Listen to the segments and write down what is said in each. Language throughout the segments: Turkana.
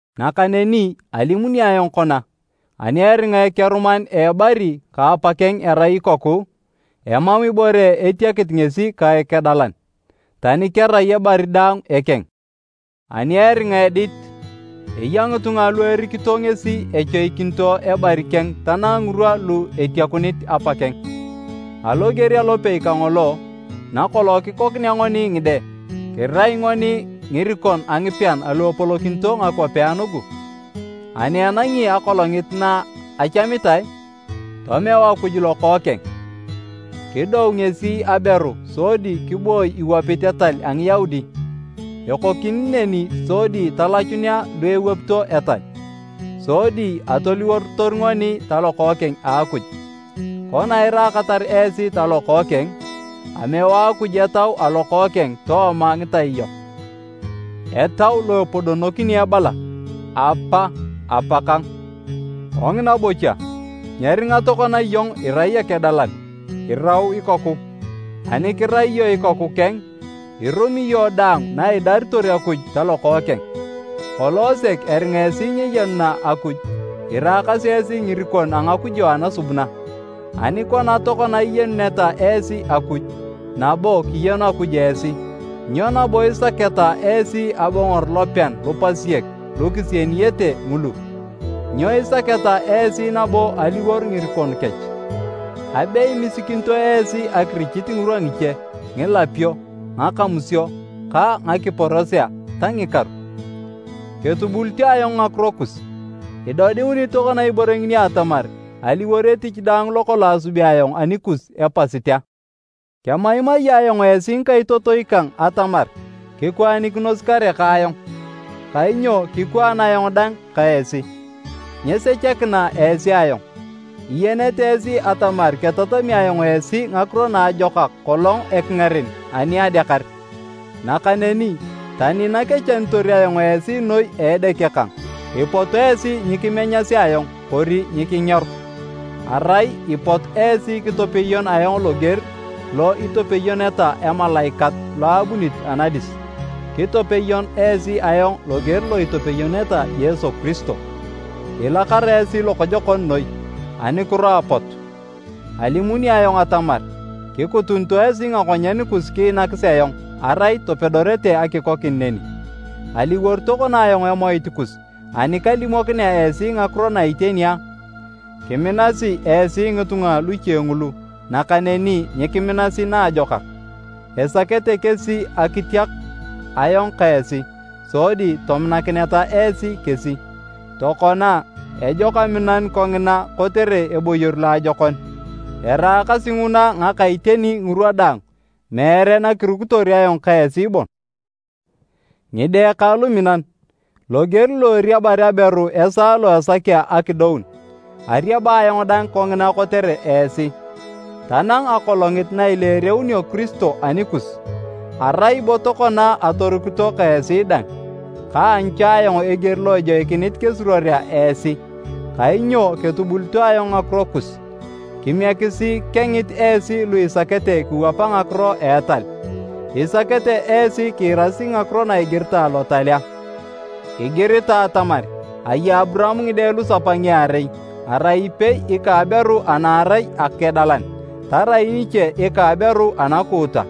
Nakaneni alimuni ayong kona, ani eringa ekeruman a ebari ka apakeng erai ikoku, emam ibore etiakit ngesi ka ekedalan, tani kerai ebari daang ekeng. Ani eringa edit, eya ngitunga lu erikito ngesi echoikinito ebari keng tanang ngirwa lu etiakunit apakeng. Aloger alopei kangolo, nakolong kikonea ngoni ngide, kirai ngoni ngirikon a ngipean alu epolokinito ngakwapea nugu. Ani enangi akolongit na achamitae, tomeu Akuj Lokookeng. Kidou ngesi aberu sodi kiboi iwapit etal a Ngiyaudi, ekokini neni sodi talachunea lu ewapito etal, sodi atoliworotor ngoni talokookeng a Akuj. Kona iraakatar esi talokookeng, ameu Akuj Etau a Lokookeng tooma ngitai yok, Etau lo epodonokini ebala, “Apa, Apakang.” Kongina bocha, nyeringa tokona iyong irai ekedalan, iliwor ikoku. Ani kirai iyong ikoku keng, irumi iyong daang na idaritor Akuj talokookeng. Kolong sek eringa esi nyeyenuna Akuj, iraakasi esi ngirikon a ngakujo anasubuna. Ani kona tokona iyenuneta esi Akuj, nabo kiyenu Akuj esi, nyo nabo isaketa esi abongor lopean lupasiek lu kisieniyete ngulu? Nyo isaketa esi nabo aliwor ngirikon kech? Abe imisikinito esi akirichit ngirwa ngiche, ngilapio, ngakamusio ka ngakiporosea ta ngikaru. Ketubulito ayong ngakiro kus! Idodiunit tokona ibore ngini atamar aliwor etich daang lokolong asubi ayong anikus epasit a? Kemaimai ayong esi ngikaitotoi kang atamar kikwaanikinos kare ka ayong, kainyo kikwaan ayong dang ka esi. Nyesechakina esi ayong. Iyenete esi atamar ketatami ayong esi ngakiro naajokak kolong ekingaren ani adeakar. Nakaneni tani nakechanitor ayong esi noi a edeke kang, ipot esi nyikimenyasi ayong kori nyikingeor. Arai ipot esi kitopeyon ayong loger lo itopeyoneta emalaikat lo ebunit anadis, kitopeyon esi ayong loger lo itopeyoneta Yesu Kiristo. Ilakara esi lokojokon noi! Anukiro apotu? Alimuni ayong atamar, kikutunito esi ngakonyen kus kiinakis ayong, arai topedorete akikokin neni. Aliwor tokona ayong emoit kus ani kalimokinea esi ngakiro na iteni a? Kiminasi esi ngitunga luche ngulu, nakaneni nyikiminasi naajokak. Esakete kesi akitiak ayong ka esi sodi tominakineta esi kesi. Tokona, ejok aminanu kongina kotere eboyor loajokon, eraakasi nguna ngaka iteni ngirwa daang, meere nakirukitor ayong ka esi bon. Ngide kang luminan! Loger lo eriabar aberu esaa lo esakea akidoun, ariaba ayong dang kongina kotere esi, tanang akolongit na ileereunio Kiristo anikus. Arai bo tokona atorukito ka esi dang! Kaanyu cha ayong eger lo ejoikinit kesuruorea esi kainyo ketubulito ayong ngakiro kus! Kimiekisi kengit esi lu isakete kiwapa ngakiro a etal. Isakete esi kiirasi ngakiro na igiritae Lotal a? Igiritae atamar aya Aburaam ngide lusapa ngiarei, arai ipei ika aberu ana arai akedalan, tarai niche ika aberu anakuuta.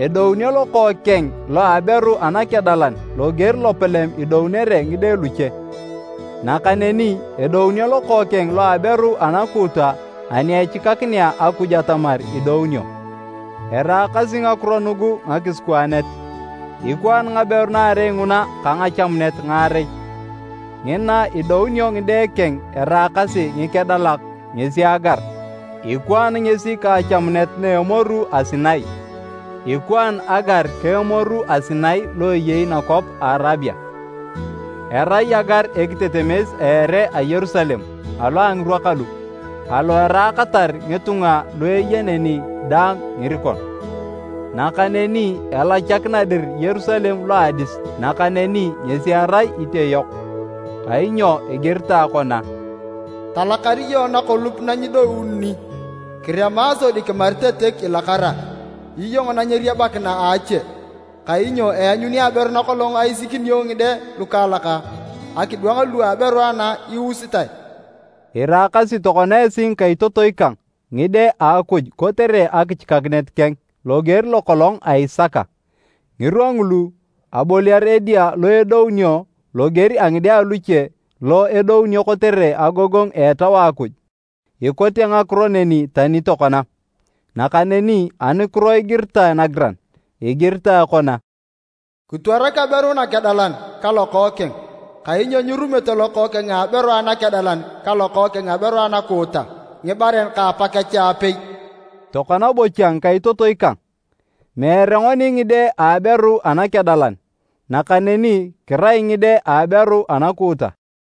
Edounio lokookeng lo aberu anakedalan loger lopalem idounere ngide luche, nakaneni edounio lokookeng lo aberu anakuuta ani echikakinea Akuj atamar idounio. Eraakasi ngakiro nugu ngakisikwaanet, ikwaan ngaberu naarei nguna ka ngachamunet ngaarei. Ngina idounio ngide keng eraakasi ngikedalak ngesi Agar, ikwaan ngesi ka achamunet na a Emoru a Sinai. Ikwaan Agar ka Emoru a Sinai lo eyei nakwap ka Arabia. Erai Agar ekitetemes a ere a Yerusalem alo a ngirwa kalu, alo eraakatar ngitunga lu eya neni daang ngirikon. Nakaneni elachakina dir Yerusalem lo a adis, nakaneni ngesi erai itioyok. Kainyo igiritae kona, “Talakar iyong nakolup na nyidoununi! Kirema sodi kimaritetek ilakara, iyong na nyeriabakina a ache! Kainyo eanyuni aberu nakolong aisikinio ngide lukaalak, akidwang lu a aberu ana iusitae.” Iraakasi tokona esi ngikaitotoi kang, ngide a Akuj kotere akichikakinet keng, loger lokolong a Isaka. Ngirwa ngulu, aboliar edia lo edounio loger a ngide aluche lo edounio kotere agogongu a Etau a Akuj, ikote ngakiro neni tani tokona. Nakaneni anukiro igiritae nagiran? Igiritae kona, “Kitwarak aberu nakedalan ka lokookeng, kainyo nyirumete lokookeng a aberu anakedalan ka lokookeng a aberu anakuuta ngibaren ka apakech aapei.” Tokona bocha ngikaitotoi kang, meere ngoni ngide a aberu anakedalan, nakaneni kirai ngide a aberu anakuuta.